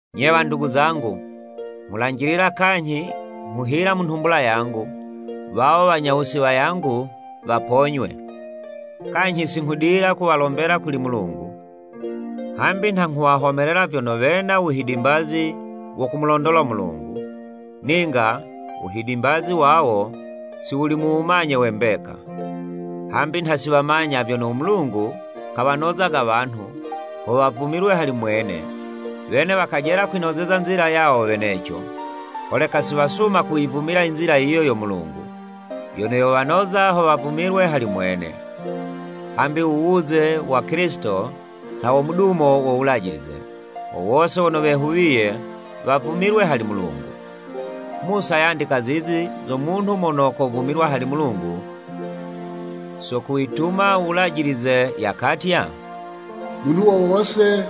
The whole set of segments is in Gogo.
Nye wandugu zangu, nghulanjilila kanyhi nghuhila mu nhumbula yangu, wawo wanyawusi wayangu waponywe. Kanyhi si nghudila kuwalombela kuli Mulungu. Hambi nha nghuwahomelela vyono, wena uwuhidimbazi wo kumulondola u Mulungu, ninga uwuhidimbazi wawo, si wuli mu wumanye we mbeka. Hambi nha si wamanya vyono u Mulungu kawanozaga wanhu, ho wavumilwe hali mwene, wene wakajela kwinozeza nzila yawo weneco, holeka si wasuma kuyivumila inzila yiyo yo Mulungu, yono yowanoza ho wavumilwe hali mwene. Hambi u wuze wa Kilisito, nha wo mudumo wo Wulajilize, ho wose wono wehuwiye wavumilwe hali Mulungu. Musa yandika zizi zo munhu mono kovumilwa hali Mulungu so kuwituma u Wulajilize, yakatya; “U munhu wo wose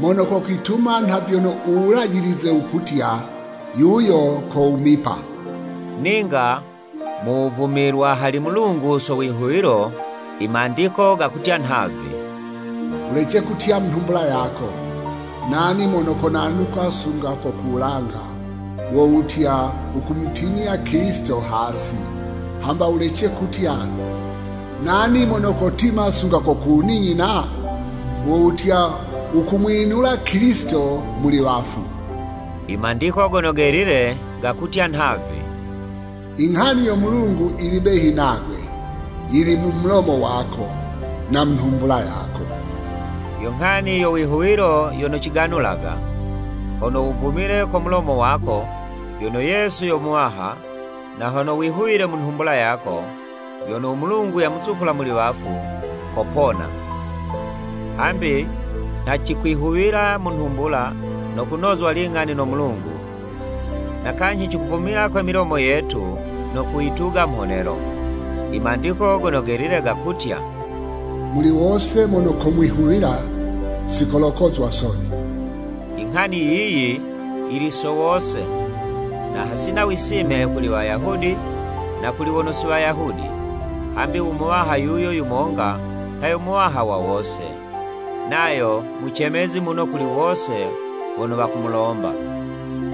mono kokwituma nha vyono u Wulajilize wukutya, yuyo kowumipa.” Ninga mu wuvumilwa hali Mulungu so wihuwilo, i Mandiko gakutya nhavi, “Wulece kutya mu nhumbula yako. Nani mono konanuka sunga ko ku wulanga?” (wo wutya, wukumutimya Kilisito hasi), “Hamba wulece kutya, Nani mono kotima sunga ku ku wuninyina?” (wo wutya, wukumwinula Kilisito muli wafu.) I Mandiko Gono Gelile gakutya nhavi: “Inghani yo Mulungu yili behi nagwe, yili mu mulomo wako na mu nhumbula yako,” yo nghani yo wihuwilo yono ciganulaga. Hono wuvumile ko mulomo wako, vyono Yesu yo Muwaha, na hono wihuwile mu nhumbula yako, vyono u Mulungu yamuzukula muli wafu, kupona. Hambi nha cikwihuwila mu nhumbula, no kunozwa ling'ani no Mulungu, na kanyhi cikuvumila kwe milomo yetu no kuyituga mhonelo. I Mandiko Gono Gelile gakutya, “Muli wose mono kumwihuwila, si kolokozwa soni.” Inghani yiyi yili so wose, na hasina wisime kuli Wayahudi na kuli wono si Wayahudi, hambi u Muwaha yuyo yumonga, nha yo Muwaha wa wose, nayo mucemezi muno kuli wose wono wakumulomba.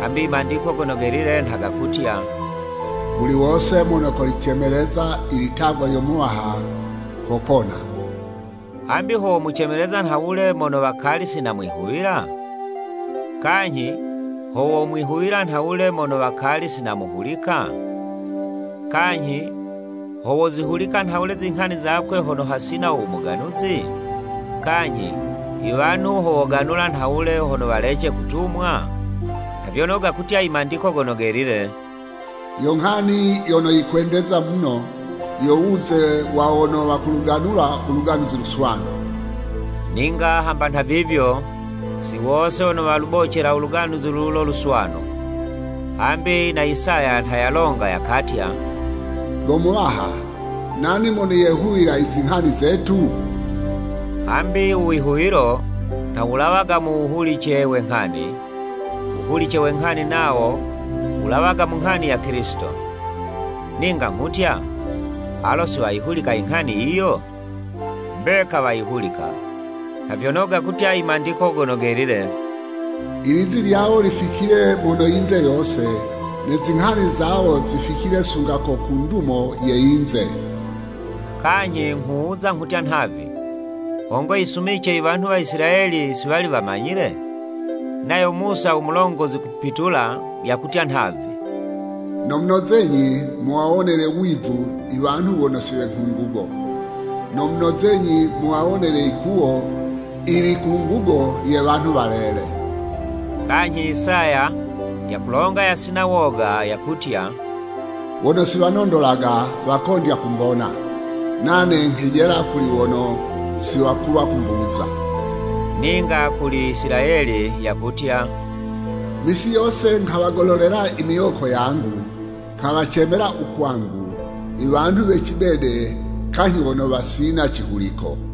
Hambi I Mandiko Gono Gelile nha gakutya, “Muli wose mono kolicemeleza ilitagwa lyo Muwaha kopona.” Hambi, ho womucemeleza nhawule mono wakali si namwihuwila? Kanyhi, ho womwihuwila nhawule mono wakali si namuhulika? Kanyhi, ho wozihulika nhawule izinghani zakwe hono hasina u muganuzi? Kanyhi, iwanhu ho woganula nhawule hono walece kutumwa? Nha vyono gakutya i Mandiko Gono Gelile, “Yo nghani yono yikwendeza muno, yo wuze wa wono wakuluganula u Luganuzi Luswanu.” Ninga hamba nhavivyo, si wose wono walubocela u Luganuzi lulo Luswanu. Hambi na Isaya nha yalonga yakatya, “Go Muwaha, nani mono yehuwila izinghani zetu?” Hambi u wihuwilo nha wulawaga mu wuhulice we nghani, wuhulice we nghani nawo wulawaga mu nghani ya Kilisito. Ninga nghutya, alo si wayihulika inghani yiyo? Mbeka wayihulika, nha vyono gakutya i Mandiko Gono Gelile. “Ilizi lyawo lificile mono yinze yose, Ne zinghani zawo zificile sunga ko ku ndumo ye yinze.” Kanyhi nghuwuza nghutya nhavi, Hongo yisumice iwanhu wa Isilayeli si wali wamanyile? Nayo Musa u mulongozi kupitula, yakutya nhavi, “Nomunozenyi muwawonele wivu iwanhu wono si nghungugo, Nomunozenyi muwawonele likuwo ilikungugo lye wanhu walele.” Kanyhi Isaya yakulonga yasina woga, yakutya, “Wono si wanondolaga, wakondya kumbona, Nane nghelajila kuli wono si wakuwa kumbuza.” Ninga kuli Isilayeli, yakutya, “Misi yose nghawagololela imiwoko yangu nghuwacemela u kwangu, I wanhu we cibede kanyhi wono wasina cihuliko.”